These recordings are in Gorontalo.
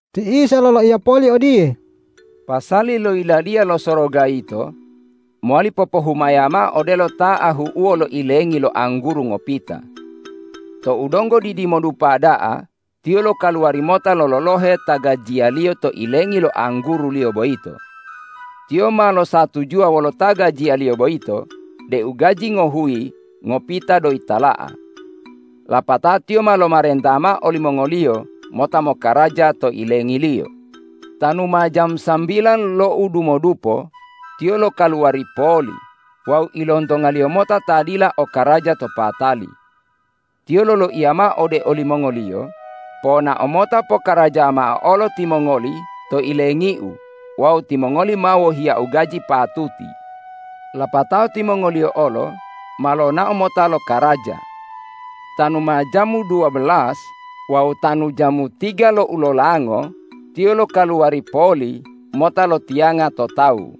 Ti Isa loloiya poli odiye,”Pasali lo Yiladiya lo Soroga yito mowali popohumaya mao odelo ta ahu'uwo lo ilengi lo angguru ngopita. Tou donggo didimodupa da'a tiyo lokaluwari mota lololohe ta gajiyaliyo to ilengi lo angguruliyo boyito. Tiyo ma losatujuwa wolo ta gajiyaliyo boyito deu gaji ngohuyi ngopita doyi tala'a. Lapatao tiyo ma lomarenta mao olimongoliyo mota mokaraja to ilengiliyo. Tanu ma jamu sambilan lo udumodupo tiyo lokaluwari poli wawu ilontongaliyo mota ta dila o karaja to patali. Tiyo loloiya mao ode olimongoliyo, ’Ponao mota pokaraja mao olo timongoli to ilengiu wawu timongoli ma wohiyau gaji patuti.’ Lapatao timongoliyo olo ma lonao mota lo karaja. Tanu ma jamu duwabelas wawu tanu jamu tiga lo ulolango tiyo lokaluwari poli mota lotiyanga to tawu.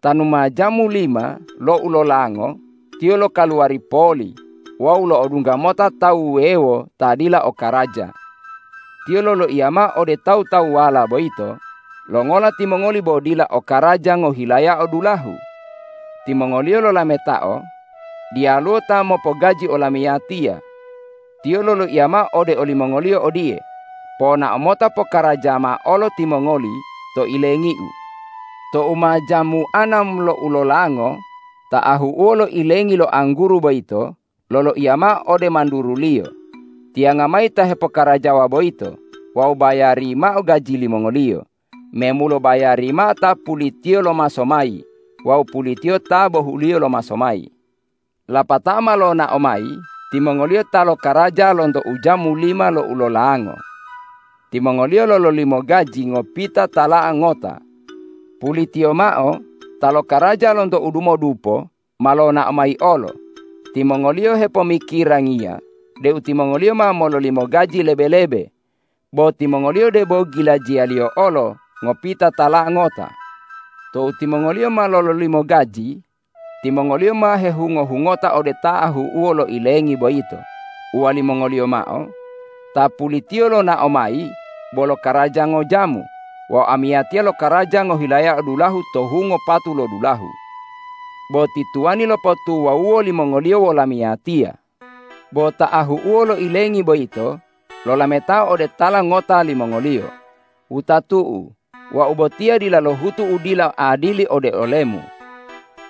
Tanu ma jamu lima lo ulolango tiyo lokaluwari poli wawu lo'odungga mota tawu wuwewo ta dila o karaja. Tiyo loloiya mao ode tawu-tawuwala boyito, ’Longola timongoli bo dila o karaja ngohilayao dulahu?’ Timongoliyo lolametao, ’Diyaluwo ta mopogaji olamiyatiya.’ Tiyo loloiya mao ode olimongoliyo odiye, ’Ponao mota pokaraja mao olo timongoli to ilengiu.’ Tou ma jamu anam lo ulolango ta ahu'uwo lo ilengi lo angguru boyito loloiya mao ode manduruliyo, ’Tiyanga mayi ta hepokarajawa boyito wawu bayari mao gaji limongoliyo, memulo bayari mao ta pulitiyo lomaso mayi wawu pulitiyo ta bohuliyo lomaso mayi.’ Lapatao ma lonao mayi timongoliyo ta lokaraja lonto ujamu lima lo ulolango. Timongoliyo lololimo gaji ngopita tala'a ngota. Pulitiyo mao ta lokaraja lonto udumodupo ma lonao mayi olo. Timongoliyo hepomikirangiya deu timongoliyo ma mololimo gaji lebe-lebe. Bo timongoliyo debo gilajiyaliyo olo ngopita tala'a ngota. Tou timongoliyo ma lololimo gaji, timongoliyo ma hehungo-hungota ode ta ahu'uwo lo ilengi boyito uwalimongoliyo mao, ’Ta pulitiyo lonao mayi bo lokaraja ngojamu wawu amiyatiya lokaraja ngohilayao dulahu to hungo patu lo dulahu. Bo ti tuwani lopotuwawuwo limongoliyo wolamiyatiya.’ Bo ta ahu'uwo lo ilengi boyito lolametao ode tala ngota limongoliyo, ’Wutatu'u, wau botiya dila lohutu u dila adili ode olemu.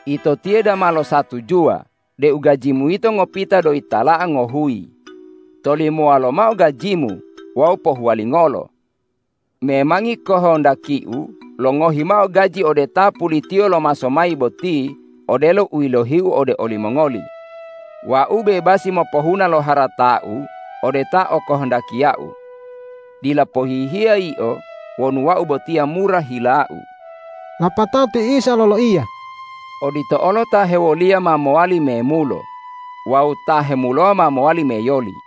Ito tiye dama losatujuwa deu gajimu yito ngopita doyi tala'a ngohuyi. Tolimowa lomao gajimu wawu pohuwalingolo. Memangi kohondakiu longohi mao gaji ode ta pulitiyo lomaso mayi boti odelo u yilohiu ode olimongoli. Wau bebasi mopohuna lo haratau ode ta o kohondakiu. Dila pohihiya yio wonu wau botiya mura hilau.’” Lapatao ti Isa loloiya,”Odito olo ta hewoliya ma mowali memulo wawu ta hemulowa ma mowali meyoli.”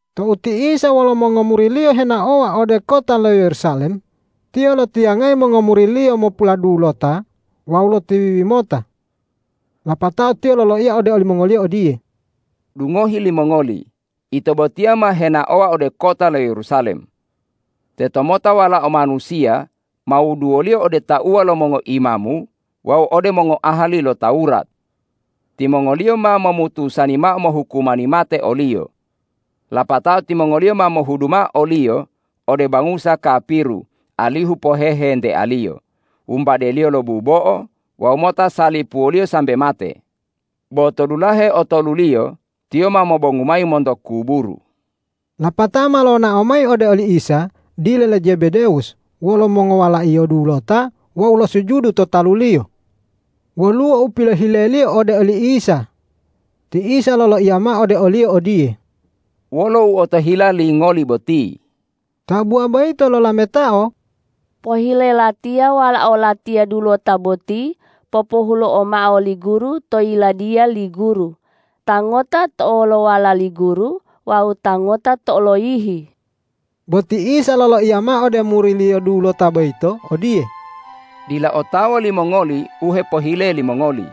Tou ti Isa wolo mongomuri-Liyo henaowa ode kota lo Yerusalem, Tiyo lotiyangayi mongomuri-Liyo mopuladulota wawu lotiwiwi mota. Lapatao Tiyo loloiya ode olimongoliyo odiye, ”Dungohi limongoli, ito botiya ma henaowa ode kota lo Yerusalem. Tetomota Walao Manusiya ma wuduwoliyo ode tauwa lo mongoimamu wawu ode mongoahali lo Tawurat. Timongoliyo ma momutusani mao mohukumani mate o-Liyo. Lapatao timongoliyo ma mohudu mao o-Liyo ode bangusa kapiru alihu pohehentealiyo, wumbadeliyo lo bubo'o wawu mota salipuwoliyo sambe mate. Bo to dulahe otoluliyo Tiyo ma mobongu mayi monto kuburu.” Lapatao ma lonao mayi ode oli Isa dile le Zebedewus wolo mongowalaiyo dulota wawu losujudu to talu-Liyo. Woluwo u pilohileliyo ode oli Isa. Ti Isa loloiya mao ode oliyo odiye,”Wolo u otohila lingoli boti?” Tabuwa boyito lolametao,”Pohile latiya walao latiya dulota boti popohulo'o mao li Guru to Yiladiya li Guru, ta ngota to olowala li Guru wawu ta ngota to oloyihi.” Bo ti Isa loloiya mao ode muri-Liyo dulota boyito odiye,”Dila otawa limongoli u hepohile limongoli.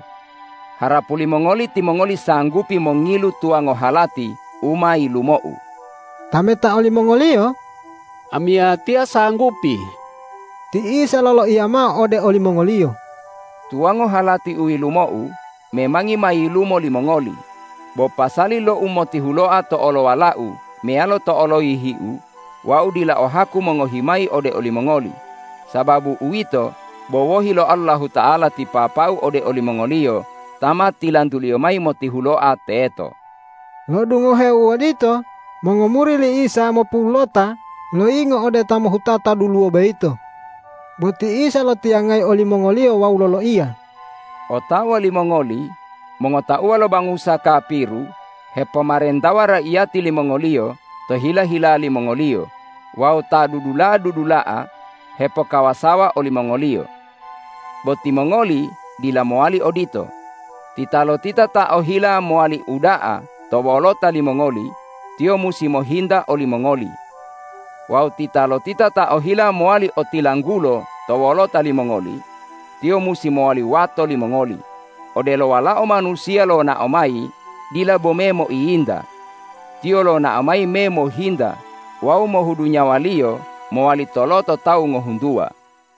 Harapu limongoli timongoli sanggupi mongilu tuwango halati u ma yilumo-U?” Tametao limongoliyo,”Amiyatiya sanggupi.” Ti Isa loloiya mao ode olimongoliyo,”Tuwango halati u yilumo-U memangi ma yilumo limongoli, bo pasali lo umotihuloa to olowala-U meyalo to oloyihi-U Wau dila o haku mongohi mayi ode olimongoli, sababu uwito bo wohi lo Allahuta'ala ti Papa-U ode olimongoliyo ta ma tilantu-Liyo mayi motihuloa teto.” Lo'odungoheo u odito mongomuri li Isa mopulota loyingo ode ta mohutata duluwo boyito. Bo ti Isa lotiyangayi olimongoliyo wawu loloiya,”Otawa limongoli mongotauwa lo bangusa kapiru hepomarentawa raiyati limongoliyo to hila-hila limongoliyo wawu ta dudula'a-dudula'a hepokawasawa olimongoliyo. Bo timongoli dila mowali odito. Titalotita ta ohila mowali uda'a to wolota limongoli, tiyo musi mohinta olimongoli. Wawu titalotita ta ohila mowali otilanggulo to wolota limongoli, tiyo musi mowali wato limongoli, odelo Walao Manusiya lonao mayi dila bome moiyinta. Tiyo lonao mayi me mohinta wawu mohudu nyawa-Liyo mowali toloto tawu ngohuntuwa.”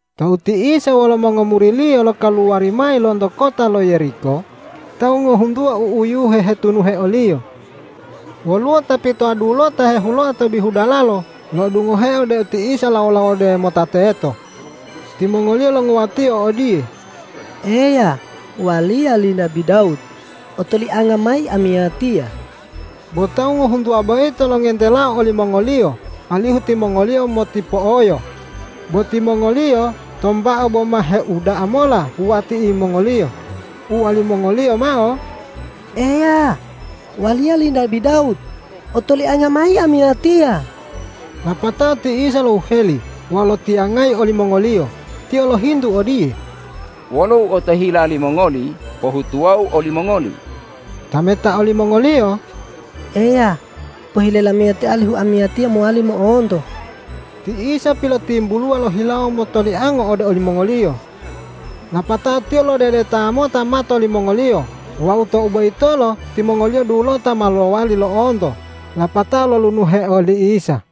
Tou ti Isa wolo mongomuri-Liyo lokaluwari mayi lonto kota lo Yeriko, tawu ngohuntuwa u'uyuhe hetunuhe o-Liyo. Woluwo ta pitoa dulota hehuloa to bihu dalalo lo'odungoheo deu ti Isa lawo-lawode mota teto. Timongoliyo longuwatio odiye,”Eya, waliya li nabi Dawud, otolianga mayi amiyatiya!” Bo tawu ngohuntuwa boyito longentelao olimongoliyo alihu timongoliyo motipo'oyo. Bo timongoliyo tombao boma heuda'a mola wuwati'iyo, uwalimongoliyo mao,”Eya, waliya li nabi Dawud, otolianga mayi amiyatiya!” Lapatao ti Isa lohuheli wawu lotiyangayi olimongoliyo. Tiyo lohintu odiye,”Wolo u otohila limongoli pohutuwo-U olimongoli?” Tametao limongoliyo,”Eya, pohile lamiyatiya alihu amiyatiya mowali mo'onto.” Ti Isa pilotimbuluwa lohilawo motoliango ode olimongoliyo, lapatao Tiyo lodedeta mota mato limongoliyo wawu tou boyitolo timongoliyo dulota ma lowali lo'onto lapatao lolunuhe oli Isa.